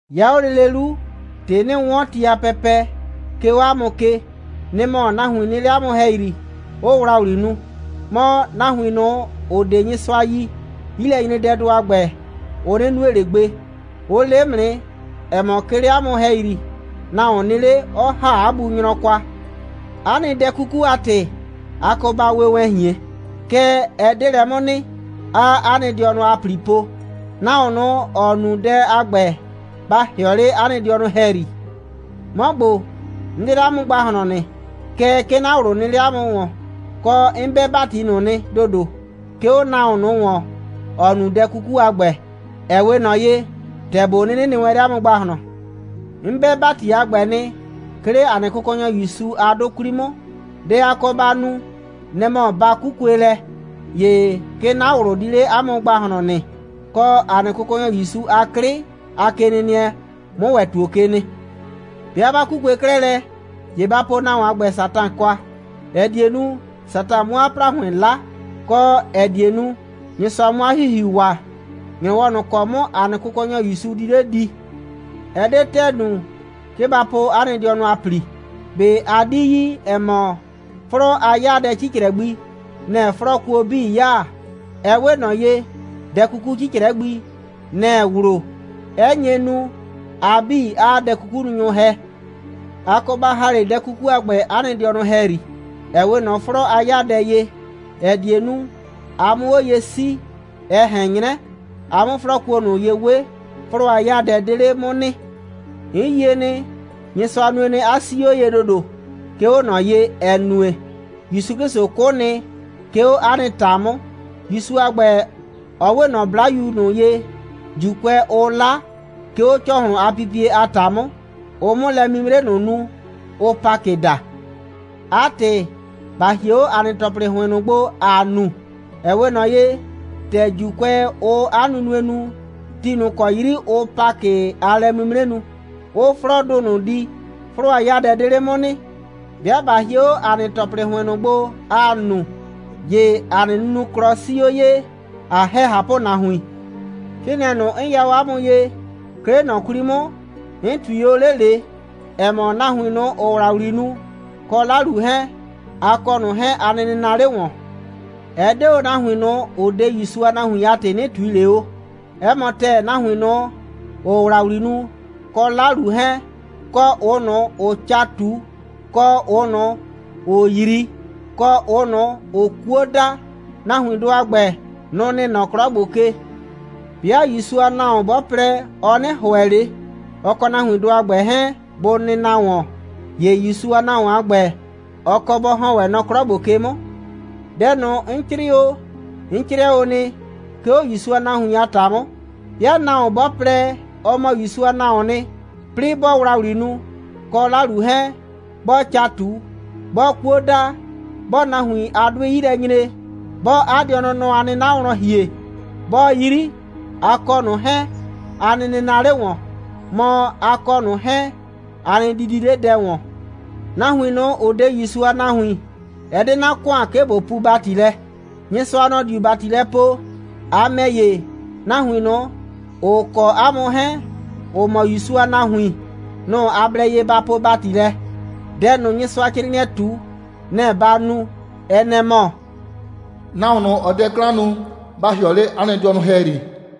'Ya 'o lele 'lu, ‑tɩ 'nɩɩ 'wɔn ti a pɛpɛ, 'ke 'o 'a mʋ ke, nɩ‑ mɔ, nahuin nɩ 'le 'a mʋ ‑hɛyri, 'ʋʋ ‑wlawli nu. Mɔ, nahuin ꞊nʋ, ‑ʋ 'de Nyɩsʋa yi, 'yilɛnyredɛdʋ a ‑gbɛ, ʋ 'nɩ nue ꞊le gbe. Ʋ le 'mʋ nɩ, ‑ɛ mɔ, 'ke 'le 'a mʋ ‑hɛyri, nahuon nɩ 'le, 'ɔ ‑ha 'a bu nyrɔ kwa. 'A nɩ dɛ 'kuku a ‑tɩ, a kɔ ba we wɛn ꞊hien. Kɛɛ, ɛ 'de lɛ 'mʋ nɩ, 'aa 'a nɩ dɩɔnʋ a ‑pli po. Nahuon ꞊nʋ, ‑ɔ nu dɛ a ‑gbɛ, ba ‑hɩɔ 'le 'a nɩ dɩɔnʋ ‑hɛyri. 'Mɔ ‑gbo, 'n 'de 'le 'a mʋ ‑gbahlɔn nɩ. Kɛɛ, 'ke 'na ꞊wlʋ nɩ 'le 'a mʋ ‑wɔn, kɔ, 'n 'bɛ ‑bati ꞊nʋ nɩ ‑dodo, 'ke 'o nahuon ꞊nʋ ‑wɔn, ‑ɔ nu dɛ 'kuku a ‑gbɛ, ‑ɛ 'we ꞊nɔ ye, ‑tɛ ꞊bo 'nɩnɩ nɩ wɛn 'le 'a mʋ ‑gbahlɔn. 'N 'bɛ ‑bati a ‑gbɛ nɩ, 'ke 'le ‑a nɩ Kʋkɔnyɔ ‑Yusu a 'dʋ 'kwli 'mʋ. Dɛ a kɔ ba nu, nɛ‑ mɔ, ba 'kukue lɛ, ‑ye 'ke 'na ꞊wlʋ di 'le 'a mʋ ‑gbahlɔn nɩ, kɔ, ‑a nɩ Kʋkɔnyɔ ‑Yusu a 'klɩ a kenɩnɩɛ 'mʋ ‑wɛ ‑tuo ke nɩ. 'Bɩa 'ba 'kukue 'klɛɛ lɛ, ‑ye ba po nahuon a ‑gbɛ Satan kwa, ‑ɛ die nu, Satan 'mʋ 'a ‑plahʋɩn 'la, kɔ, ‑ɛ die nu, Nyɩsʋa 'mʋ 'a ‑hihiu waa, ‑nyrɔwɔ ꞊nʋ ‑kɔ 'mʋ ‑a nɩ Kʋkɔnyɔ ‑Yusu di 'le di. Ɛ 'de ‑tɛɛ nu, 'ke ba po 'a nɩ dɩɔnʋ a ‑pli. ꞊Be a 'di yi, ‑ɛ mɔ, 'flɔɔ a 'yaadɛ 'cicrɛ gbi, nɛ‑ɛ 'flɔɔkuo 'bii 'yaa? Ɛ 'we ꞊nɔ ye, dɛ 'kuku 'cicrɛ gbi, nɛ‑ɛ wlo, 'ɛ nye nu, a 'bii 'aa dɛ'kukununyʋ ‑hɛ. A kɔ ba ‑ha 'le dɛ 'kukudʋ a ‑gbɛ 'a nɩ dɩɔnʋ ‑hɛyri, ‑ɛ 'we ꞊nɔ 'flɔɔ a 'yaadɛ ye, ‑ɛ die nu, a 'mʋ 'o ye 'sii, ɛ ꞊hɛn 'nyrɛ, a 'mʋ 'flɔɔkuo ꞊nʋ ye 'we, 'flɔɔ a 'yaadɛ 'de 'le 'mʋ nɩ. 'N yie nɩ, Nyɩsʋa nue nɩ, 'a 'sii 'o ye ‑dodo, 'ke 'o ꞊nɔ ye, ‑ɛ nue, ‑Yusu 'Klɩsʋ 'kʋ nɩ, 'ke 'o 'a nɩ ‑ta 'mʋ. ‑Yusu a ‑gbɛ, ɔ 'we ꞊nɔ 'blayu ꞊nʋ ye, ‑Juukʋɛ, ʋʋ 'la, 'ke 'o ‑cɔhlʋn a pipie a ‑ta 'mʋ, ʋ 'mʋ lɛ'mimre ꞊nʋ nu, ʋʋ Pakɩ daa. 'A ‑tɩ, ‑ba hie 'o ‑a nɩ ‑tɔplɩ ‑hʋɩn ꞊nʋ gbo, ‑aa nu, ‑ɛ 'we ꞊nɔ ye, ‑tɛ ‑Juukʋɛ, ʋʋ 'a nunue nu, ti ꞊nʋ ‑kɔ 'yri ʋʋ Pakɩ a lɛ'mimre nu, ʋʋ 'flɔɔdʋ ꞊nʋ di, 'flɔɔ a 'yaadɛ 'de 'le 'mʋ nɩ. 'Bɩa ꞊ba hie 'o ‑a nɩ ‑tɔplɩ ‑hʋɩn ꞊nʋ gbo, ‑aa nu, ‑ye ‑a nɩ nunuklɔ 'sii 'o ye, ꞊a ‑hɛ ꞊hapʋnahuin. 'Crɩɩnɩɛ ꞊nʋ, 'n ya o 'a mʋ ye, 'ke 'le ꞊nɔ 'kwli 'mʋ, 'n ꞊tui o 'le ꞊le, ‑ɛ mɔ, nahuin ꞊nʋ, ‑ʋʋ ‑wlawli nu, kɔ 'lalu 'hɛɛn, a kɔ ꞊nʋ 'hɛɛn, a nɩ nɩnaa 'le ‑wɔn. Ɛ 'de o nahuin ꞊nʋ, ‑ʋ 'de ‑Yusu a nahuin a ‑tɩ, 'nɩ ꞊tui ꞊le o. 'Ɛ mɔ ‑tɛɛ, nahuin ꞊nʋ, ‑ʋʋ ‑wlawli nu, kɔ 'lalu 'hɛɛn, kɔ ꞊ʋ ꞊nʋ, ‑ʋʋ ca ꞊tu, kɔ ꞊ʋ ꞊nʋ, ‑ʋʋ 'yri, kɔ ꞊ʋ ꞊nʋ, ‑ʋʋ 'kuo da, nahuindʋ a ‑gbɛ, nʋ‑ nɩ nɔ 'klɔ ‑gbo ke. 'Bɩa ‑Yusu a nahuon 'bɔ plɛ, ɔ 'nɩ ‑hʋɛ ꞊le, ɔ kɔ nahuindʋ a ‑gbɛ 'hɛɛn, bʋ nɩnaa ‑wɔn, ‑ye ‑Yusu a nahuon a ‑gbɛ, ɔ kɔ bɔ ‑hɔn wɛn nɔ 'klɔ ‑gbo ke 'mʋ. Dɛ ꞊nʋ, 'n 'crɩɩ o, 'n 'crɩɛ o nɩ, 'ke 'o ‑Yusu a nahuin a ‑ta 'mʋ. 'Bɩa nahuon 'bɔ plɛ, ɔ mɔ ‑Yusu a nahuoon nɩ, 'plɩɩ 'bɔɔ ‑wlawli nu, kɔ 'lalu 'hɛɛn, 'bɔɔ ca ꞊tu, 'bɔɔ 'kuo da, 'bɔɔ nahuin a 'dʋɩ 'yi lɛ nyre, 'bɔɔ 'a dɩɔnʋ nɔ a 'nɩna wlɔn ‑hie, 'bɔɔ 'yri, a kɔ ꞊nʋ 'hɛɛn, a nɩ nɩnaa 'le ‑wɔn. Mɔ, a kɔ ꞊nʋ 'hɛɛn, a nɩ didi 'le dɛ ‑wɔn. Nahuin ꞊nʋ, ‑ʋ 'de ‑Yusu a nahuin, ɛ 'de 'na ‑kʋan, 'ke ꞊bo puu ‑bati lɛ. Nyɩsʋa, nɔ‑ diu ‑bati lɛ poo. A ‑mɛ ‑ye, nahuin ꞊nʋ, ‑ʋ kɔ 'a mʋ 'hɛɛn, ‑ʋ mɔ ‑Yusu a nahuin, nʋ‑ a blɛ ye ba poo ‑bati lɛ. Dɛ ꞊nʋ, Nyɩsʋa a 'crɩɩnɩɛɛ ꞊tu, nɛ‑ ba nu. Ɛ nɛ‑ mɔ: «Nahuon ꞊nʋ, ‑ɔɔ dɛ 'klan nu, ba ‑hɩɔ 'le 'a nɩ dɩɔnʋ ‑hɛyri.»